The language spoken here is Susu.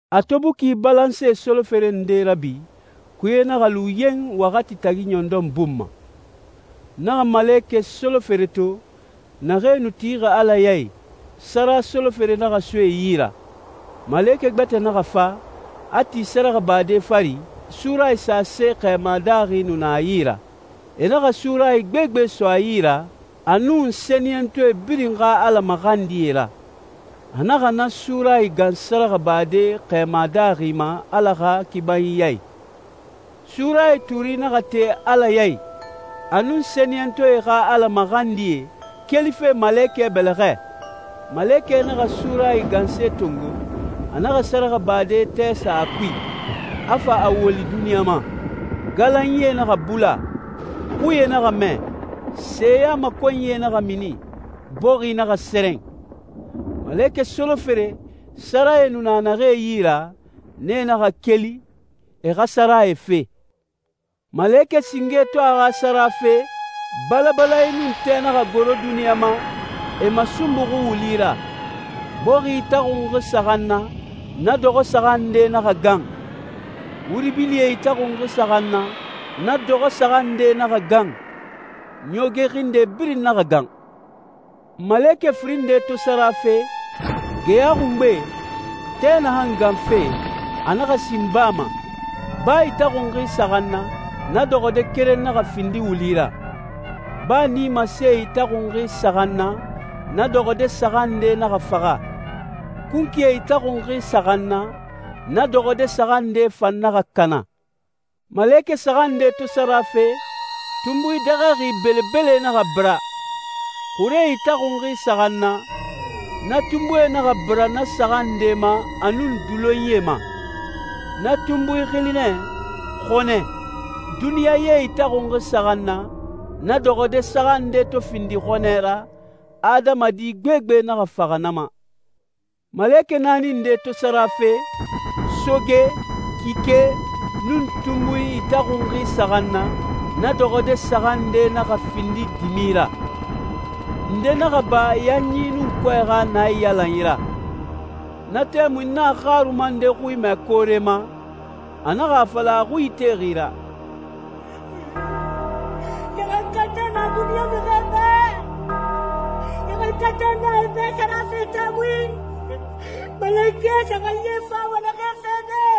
A to buki balanse solofere nde rabi, kuye naxa lu yen waxati tagi ɲɔndɔn bun ma. N naxa malekɛ solofere to, naxee nu tixi Ala ya i, sara solofere naxa so e yi ra. Malekɛ gbɛtɛ naxa fa, a ti sɛrɛxɛbade fari, surayi sase xɛɛma daaxi nu na a yi ra. E naxa surayi gbegbe so a yi ra, a nun sɛniyɛntɔɛ birin xa Ala maxandie ra. A naxa na surayi gan sɛrɛxɛbade xɛɛma daaxi ma Ala xa kibanyi ya i. Surayi tuuri naxa te Ala ya i, a nun sɛniyɛntɔɛ xa Ala maxandie, kelife malekɛ bɛlɛxɛ. Malekɛ naxa surayi ganse tongo, a naxa sɛrɛxɛbade tɛ sa a kui, a fa a woli duniɲa ma. Galanyie naxa bula, xuie naxa mɛ, seyamakɔnyie naxa mini, bɔxi naxa sɛrɛn. Malekɛ solofere, sarae nu na naxee yi ra, nee naxa keli, e xa sarae fe. Malekɛ singe to a xa sara fe, balabalanyi nun tɛ naxa goro duniɲa ma, e masunbuxi wuli ra. Bɔxi itaxunxi saxan na, na dɔxɔde saxan nde naxa gan. Wuri bilie itaxunxi saxan na, na dɔxɔde saxan nde naxa gan. Ɲooge xinde birin naxa gan. Malekɛ firin nde to sara fe, geya xungbe, tɛ naxan ganfe, a naxa sin baa ma. Baa itaxunxi saxan na, na dɔxɔde keren naxa findi wuli ra. Baa nimasee itaxunxi saxan na, na dɔxɔde saxan nde naxa faxa. Kunkuie itaxunxi saxan na, na dɔxɔde saxan nde fan naxa kana. Malekɛ saxan nde to sara fe, tunbui dɛxɛxi belebele naxa bira. Xuree itaxunxi saxan na, na tunbui naxa bira na saxan nde ma a nun dulonyie ma. Na tunbui xili nɛ «Xɔnɛ.» Duniɲa ye itaxunxi saxan na, na dɔxɔde saxan nde to findi xɔnɛ ra, adamadi gbegbe naxa faxa na ma. Malekɛ naani nde to sara fe, soge, kike, nun tunbui itaxunxi saxan na, na dɔxɔde saxan nde naxa findi dimi ra. Nde naxa ba yanyi nun kɔɛ xa naiyalanyi ra. Na tɛmui n naxa xaruma nde xui mɛ koore ma, a naxa a fala a xui itexi ra, «Ɲaxankatɛ na duniɲa mixie bɛ, ɲaxankatɛ na e bɛ sara fe tɛmui, malekɛ saxanyie fama naxee fede.»